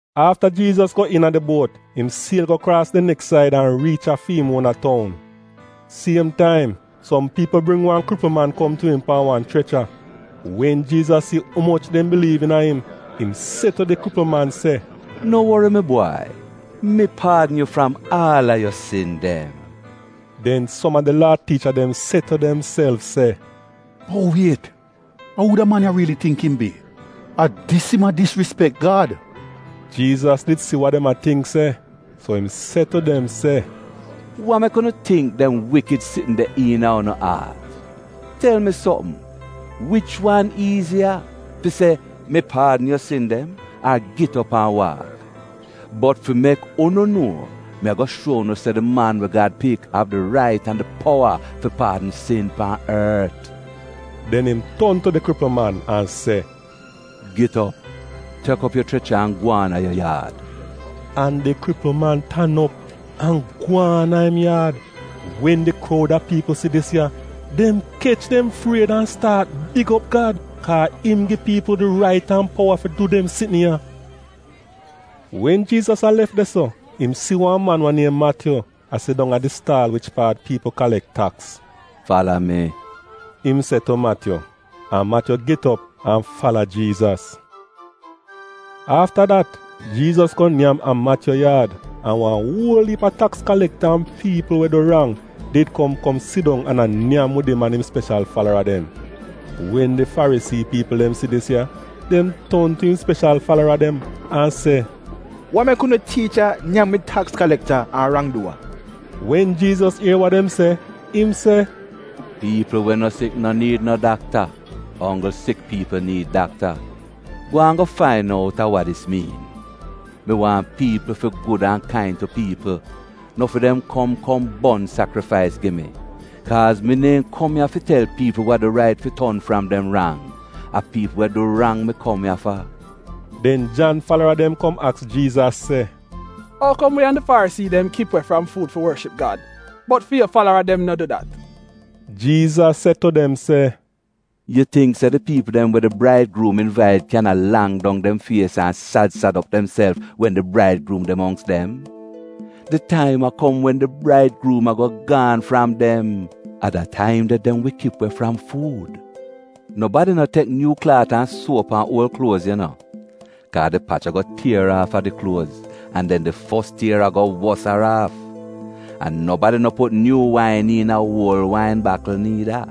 Afta Jiizas go iina di buot, im siel go kraas di neks said, an riich a fi im uona toun. Siem taim som piipl bring wan kripl man kom tu im pan wan chrecha. Wen Jiizas si umoch dem biliiv iina im, im se tu di kripl man se, “No wori mi bwai! Mi paadn yu fram aal a yu sin dem.” Den som a di Laa tiicha dem se tu demself se, “Bot wiet, a uu da man ya riili tingk im bi — a dis im a disrispek Gad!” Jiizas did si wa dem a tingk se, so im se tu dem se, “Wa mek unu tingk dem wikid sitn de iina unu aat? Tel mi sopm, wich wan iiziya, fi se, ‘Mi paadn yu sin dem’ ar ‘Git op an waak’? Bot fi mek unu nuo, mi a-go shuo unu se di Man we Gad Pik av di rait an di powa fi paadn sin pan ort,” den im ton tu di kripl man an se, “Git op, tek op yu chrecha an gwaan a yu yaad.” An di kripl man tan op, an gwaan a im yaad. Wen di kroud a piipl si dis ya, dem kech dem fried an staat big op Gad, kaa a im gi piipl di rait an powa fi du dem sitn ya. Wen Jiizas a lef de-so, im si wan man we niem Matyu a sidong a di staal wich paat piipl kalek taks. “Fala mi,” im se tu Matyu. An Matyu get op an fala Jiizas. Afta dat, Jiizas go nyam a Matyu yaad, an wan uol iip a taks kalekta an piipl we du rang did kom kom sidong an a nyam wid im an im speshal falara dem. Wen di Farisii piipl dem si dis ya, dem ton tu im speshal falara dem an se, “Wa mek unu tiicha nyam wid taks kalekta an rang-duwa?” Wen Jiizas ier wa dem se, im se, “Piipl we no sik no niid no dakta, a onggl sik piipl niid dakta. Gwaan go fain out a wa dis miin: ‘Mi waahn piipl fi gud an kain tu piipl, no fi dem kom kom bon sakrifais gi mi.’ Kaaz mi neehn kom ya fi tel piipl we du rait fi ton fram dem rang, a piipl we du rang mi kom ya fa.” Den Jan falara dem kom aks Jiizas se, “Ou kom wi an di Farisii dem kip we fram fuud fi worship Gad, bot fi yu falara dem no du dat?” Jiizas se tu dem se, “Yu tingk se di piipl dem we di braidgruum invait kyan a lang dong dem fies an sad sad op demself wen di braidgruum de mongks dem? Di taim a kom wen di braidgruum a-go gaan fram dem. A da taim de, dem wi kip we fram fuud. “Nobadi no tek nyuu klaat an suo pan uol kluoz yu no, kaa di pach a-go tier aafa di kluoz an den di fos tier a-go wosaraaf. An nobadi no put nyuu wain iina uol wain bakl niida.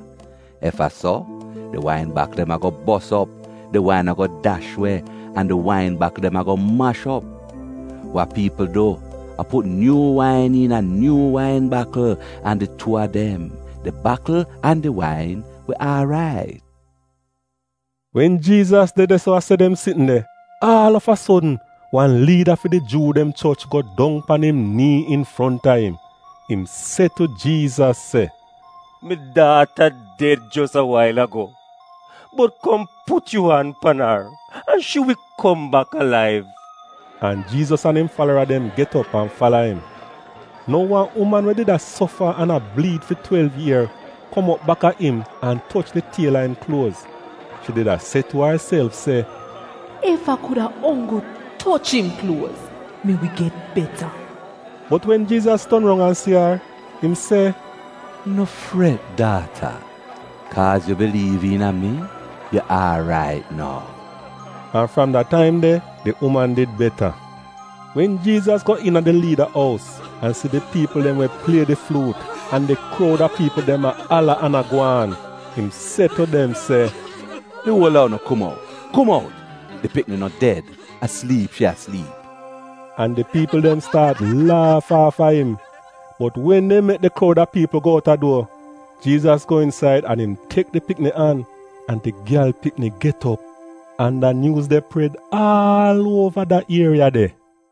Ef a so, di wain bakl dem a-go bos op, di wain a-go dash we, an di wain bakl dem a-go mash op. Wa piipl du a put nyuu wain iina nyuu wain bakl, an di tuu a dem — di bakl an di wain, wi aarait.” Wen Jiizas de de-so a se dem sitn de, aal av a sodn, wan liida fi di Juu dem choch go dong pan im nii infronta im. Im se tu Jiizas se, “Mi daata ded jos a wail ago, bot kom put yu an pan ar an shi wi kom bak alaiv.” An Jiizas an im falara dem get op an fala im. Nou wan uman we did a sofa an a bliid fi twelv ier kom op baka im an toch di tiel a im kluoz. Shi did a se tu arself se, “Ef a kuda onggl toch im kluoz, mi wi get beta.” Bot wen Jiizas ton roun an si ar, im se, “No fret daata! Kaaz yu biliiv iina mi, yu aarait nou.” An fram da taim de di uman did beta. Wen Jiizas go iina di liida ous an si di piipl dem we plie di fluut, an di kroud a piipl dem a ala an a gwaan, im se tu dem se, “Di uol a unu kum out! Kum out! Di pikni no ded; a sliip shi a sliip.” An di piipl dem staat laaf aafa im. Bot wen dem mek di kroud a piipl go outa duor, Jiizas go insaid an im tek di pikni an, an di gyal pikni get op. An da nyuuz de pred aal uova da ieriya de.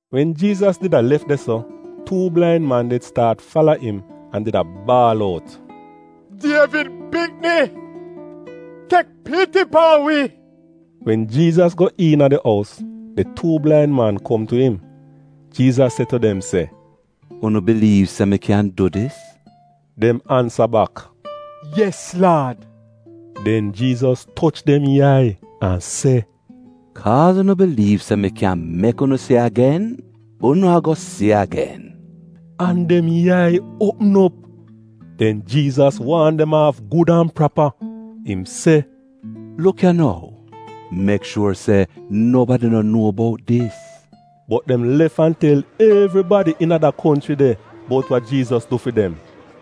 Wen Jiizas did a lef de-so, tuu blain man did staat fala im an did a baal out, “Dievid pikni! Tek piti pan wi!” Wen Jiizas go iina di ous, di tuu blain man kom tu im, Jiizas se tu dem se, “Unu biliiv se mi kyan du dis?” Dem ansa bak, “Yes, Laad.” Den Jiizas toch dem yai an se, “Kaaz unu biliiv se mi kyan mek unu si agen, unu a-go si agen.” An dem yai uopm op. Den Jiizas waan dem aaf gud an prapa. Im se, “Luk ya nou, mek shuor se, nobadi no nuo bout dis.” Bot dem lef an tel evribadi iina da konchri de, bout wa Jiizas du fi dem.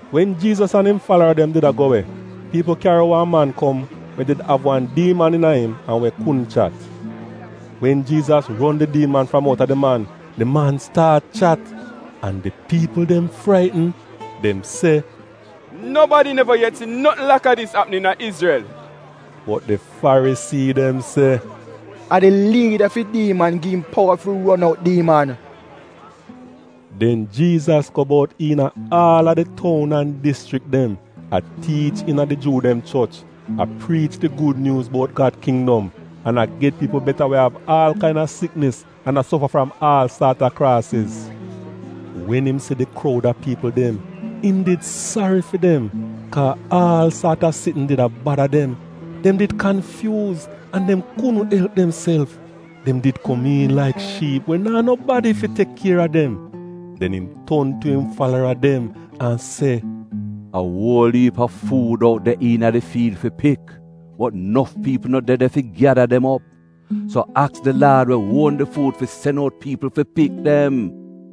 Wen Jiizas an im falara dem did a go we, piipl kyari wan man kom we did av wan diiman iina im an we kudn chat. Wen Jiizas ron di diiman fram outa di man, di man staat chat! An di piipl dem fraitn! Dem se, “Nobadi neva yet si notn laka dis apm iina Izrel!” Bot di Farisii dem se, “A di liida fi diiman gi im powa fi ron out diiman.” Den Jiizas go bout iina aal a di toun an dischrik dem a tiich iina di Juu dem choch, a priich di gud nyuuz bout Gad kindom an a get piipl beta we av aal kain-a siknis an a sofa fram aal saat a kraasiz. Wen im si di kroud a piipl dem, im did sari fi dem, kaa aal saat a sitn did a bada dem, dem did kanfyuuz an dem kudn elp demself. Dem did komiin laik shiip we naa nobadi fi tek kier a dem. Den im ton tu im falara dem an se, “A uol iip a fuud out de iina di fiil fi pik, bot nof piipl no de de fi gyada dem op. So aks di Laad we uon di fuud fi sen out piipl fi pik dem.”